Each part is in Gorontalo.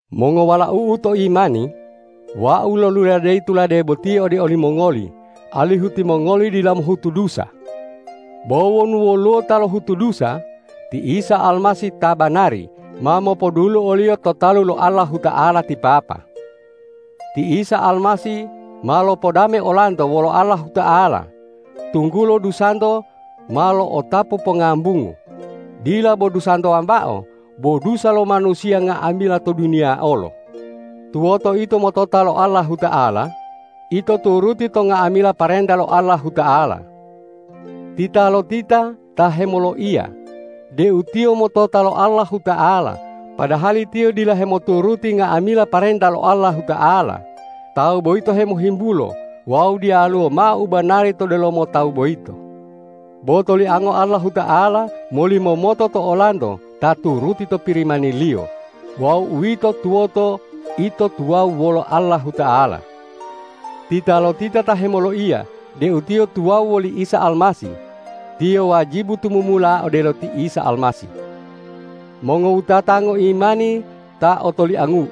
Mongowalau'u to imani, wau loluladeyi tulade boti ode olimongoli alihu timongoli dila mohutu dusa. Bo wonu woluwo ta lohutu dusa, ti Isa Almasih ta banari ma mopodulu oliyo to talu lo Allahuta'ala ti Papa. Ti Isa Almasih ma lopodame olanto wolo Allahuta'ala, tunggulo dusanto ma lo'otapu pongambungu, dila bo dusanto wambao, bo dusa lo manusiya nga'amila to duniya olo. Tuwoto ito motota lo Allahuta'ala, ito turuti to nga'amila parenta lo Allahuta'ala. Titalotita ta hemoloiya deu tiyo motota lo Allahuta'ala padahali tiyo dila hemoturuti nga'amila parenta lo Allahuta'ala, tawu boyito hemohimbulo wawu diyaluwo mao u banari to delomo tawu boyito. Bo toliango Allahuta'ala molimomoto to olanto ta turuti to Pirimani-Liyo wawu uwito tuwoto ito tuwawu wolo Allahuta'ala. Titalotita ta hemoloiya deu tiyo tuwawu woli Isa Almasih, tiyo wajibu tumumula odelo ti Isa Almasih. Mongowutata ngoimani ta otoliangu'u,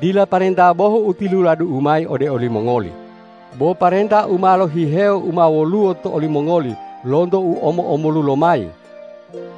dila parenta bohu u tiluladu'u mayi ode olimongoli, bo parenta u ma lohihewo u ma woluwo to olimongoli lonto u omo-omolu lomayi.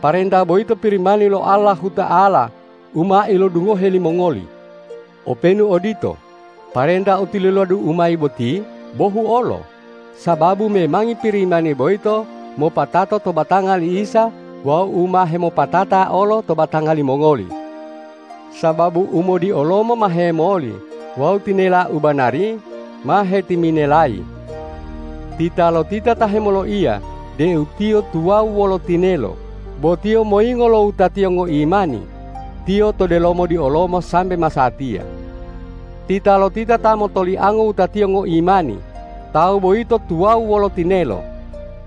Parenta boyito Pirimani lo Allahuta'ala u ma ilodungohe limongoli. Openu odito, parenta u tiluladu'u mayi boti bohu olo, sababu memangi Pirimani boyito mopatato to batanga li Isa wawu u ma hemopatata olo to batanga limongoli. Sababu umodiolomo ma hemoli wawu tinela u banari ma hetiminelayi. Titalotita ta hemoloiya deu tiyo tuwawu wolo tinelo bo tiyo moyingo lo wutatiyo ngoimani, tiyo to delomo diolomo sambe masatiya. Titalotita ta motoliango wutatiyo ngoimani, tawu boyito tuwawu wolo tinelo,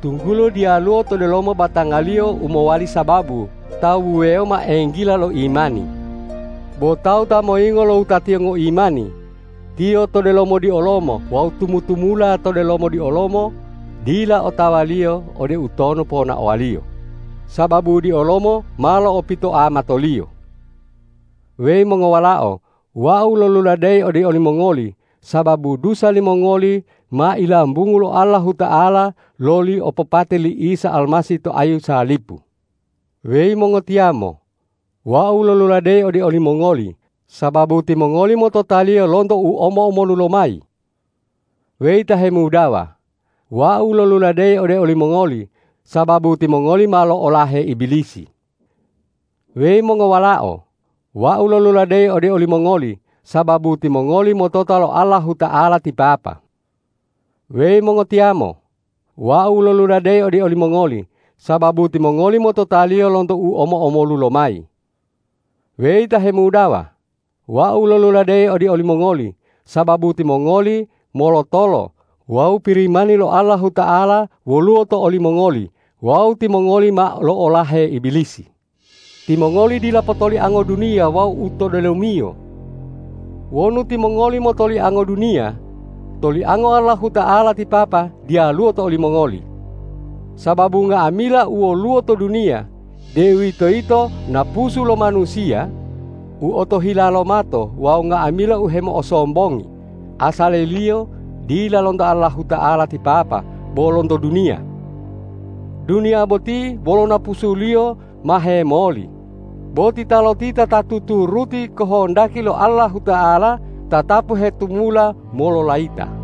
tunggulo diyaluwo to delomo batangaliyo u mowali sababu tawu wuwewo mao enggila lo imani. Bo tawu ta moyingo lo wutatiyo ngoimani, tiyo to delomo diolomo wawu tumu-tumula to delomo diolomo dila otawaliyo ode utonu ponaowaliyo, sababu diolomo ma lo'opitoa matoliyo. Weyi mongowalao, wau loluladeyi ode olimongoli, sababu dusa limongoli ma ilambungu lo Allahuta'ala loli opopate li Isa Almasih to ayu salipu. Weyi mongotiyamo, wau loluladeyi ode olimongoli, sababu timongoli motota-Liyo lonto u omo-omolu lomayi. Weyi ta hemudawa, wau loluladeyi ode olimongoli, sababu timongoli ma lo'olahe Ibilisi. Weyi mongowalao, wau loluladeyi ode olimongoli, sababu timongoli motota lo Allahuta'ala ti Papa. Weyi mongotiyamo, wau loluladeyi ode olimongoli, sababu timongoli motota-Liyo lonto u omo-omolu lomayi. Weyi ta hemudawa, wau loluladeyi ode olimongoli, sababu timongoli molotolo wawu Pirimani lo Allahuta'ala woluwo to olimongoli wawu timongoli ma lo'olahe Ibilisi. Timongoli dila potoliango duniya wawu u to delomiyo. Wonu timongoli motoliango duniya, toliango Allahuta'ala ti Papa diyaluwo to olimongoli. Sababu nga'amila u woluwo to duniya, deuwitoyito napusu lo manusiya, u otohila lo mato wawu nga'amila u hemo'osombongi, asaliliyo dila lonto Allahuta'ala ti Papa, bo lonto duniya. Duniya boti wolo napusuliyo ma hemoli, bo titalotita ta tuturuti kohondaki lo Allahuta'ala tatapu hetumula mololayita.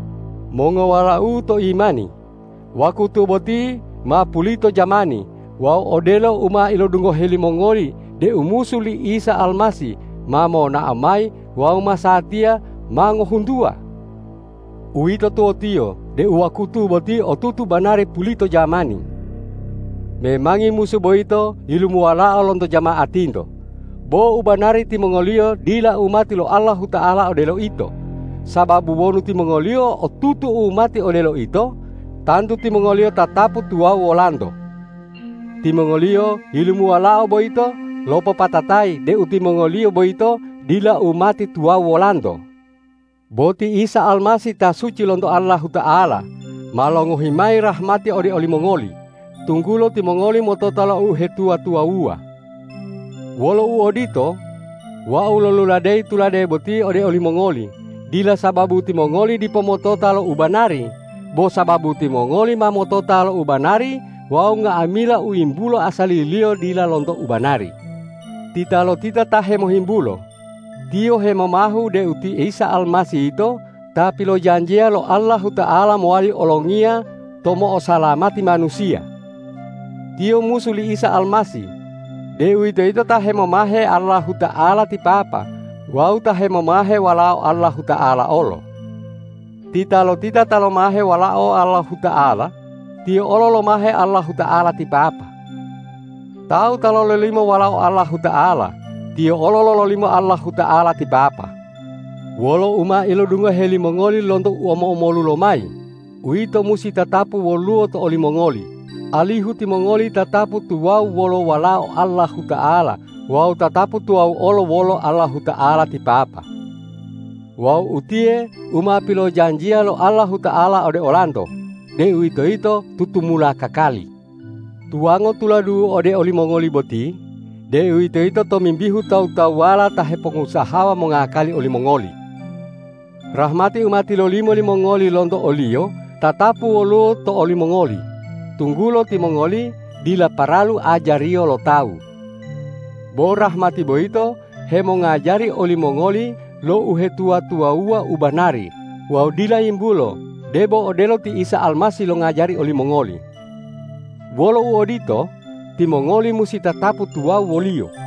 Mongowalau'u to imani, wakutu boti ma pulito jamani wawu odelo u ma ilodungohe limongoli deu musu li Isa Almasih ma monao mayi wawu masatiya ma ngohuntuwa. Uwito tuwotiyo deu wakutu boti otutu banari pulito jamani. Memangi musu boyito yilumuwalao lonto jama'atinto, bo u banari timongoliyo dila umati lo Allahuta'ala odelo ito, sababu wonu timongoliyo otutu umati odelo ito, tantu timongoliyo tatapu tuwawu wolanto. Timongoliyo yilumuwalao boyito lopopatatayi deu timongoliyo boyito dila umati tuwawu wolanto. Bo ti Isa Almasih ta suci lonto Allahuta'ala, ma longohi mayi rahmati ode olimongoli, tunggulo timongoli motota lo uhetuwa-tuwawuwa. Wolo uodito, wau loluladeyi tulade boti ode olimongoli, dila sababu timongoli dipo motota lo u banari, bo sababu timongoli ma motota lo u banari wawu nga'amila u yimbulo asaliliyo dila lonto u banari. Titalotita ta hemohimbulo, tiyo hemomahu deu ti Isa Almasih yito ta pilojanjiya lo Allahuta'ala mowali olongiya ta mo'osalamati manusiya. Tiyo musu li Isa Almasih, deuwitoyito ta hemomahe Allahuta'ala ti Papa wawu ta hemomahe Walao Allahuta'ala olo. Titalotita ta lomahe Walao Allahuta'ala, tiyo olo lomahe Allahuta'ala ti Papa. Tawu ta lololimo Walao Allahuta'ala, tiyo olo lololimo Allahuta'ala ti Papa. Wolo u ma ilodungohe limongoli lonto u omo-omolu lomayi, uwito musi tatapu woluwo to olimongoli, alihu timongoli tatapu tuwawu wolo Walao Allahuta'ala wawu tatapu tuwawu olo wolo Allahuta'ala ti Papa. Wawu utiye u ma pilojanjiya lo Allahuta'ala ode olanto, deuwitoyito tutumula kakali. Tuwango tuladu'u ode olimongoli boti, deuwitoyito tomimbihu tawu-tawuwala ta hepongusahawa mongakali olimongoli. Rahmati u ma tilolimo limongoli lonto o-Liyo tatapu woluwo to olimongoli, tunggulo timongoli dila paralu ajariyo lo tawu. Bo rahmati boyito hemongajari olimongoli lo uhetuwa-tuwawuwa u banari wawu dila yimbulo debo odelo ti Isa Almasih longajari olimongoli. Wolo uodito, timongoli musi tatapu tuwawu wo-Liyo.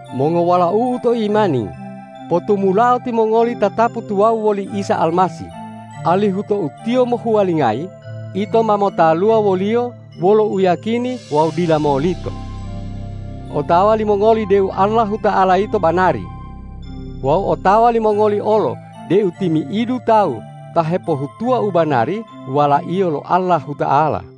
Mongowalau'u to imani, potumulao timongoli tatapu tuwawu woli Isa Almasih, alihu tou Tiyo mohuwalingayi, ito ma motaluwa wo-Liyo wolo uyiyakini wawu dila molito. Otawa limongoli deu Allahuta'ala yito banari. Wawu otawa limongoli olo deu timi'idu tawu ta hepohutuwa u banari walaiyo lo Allahuta'ala.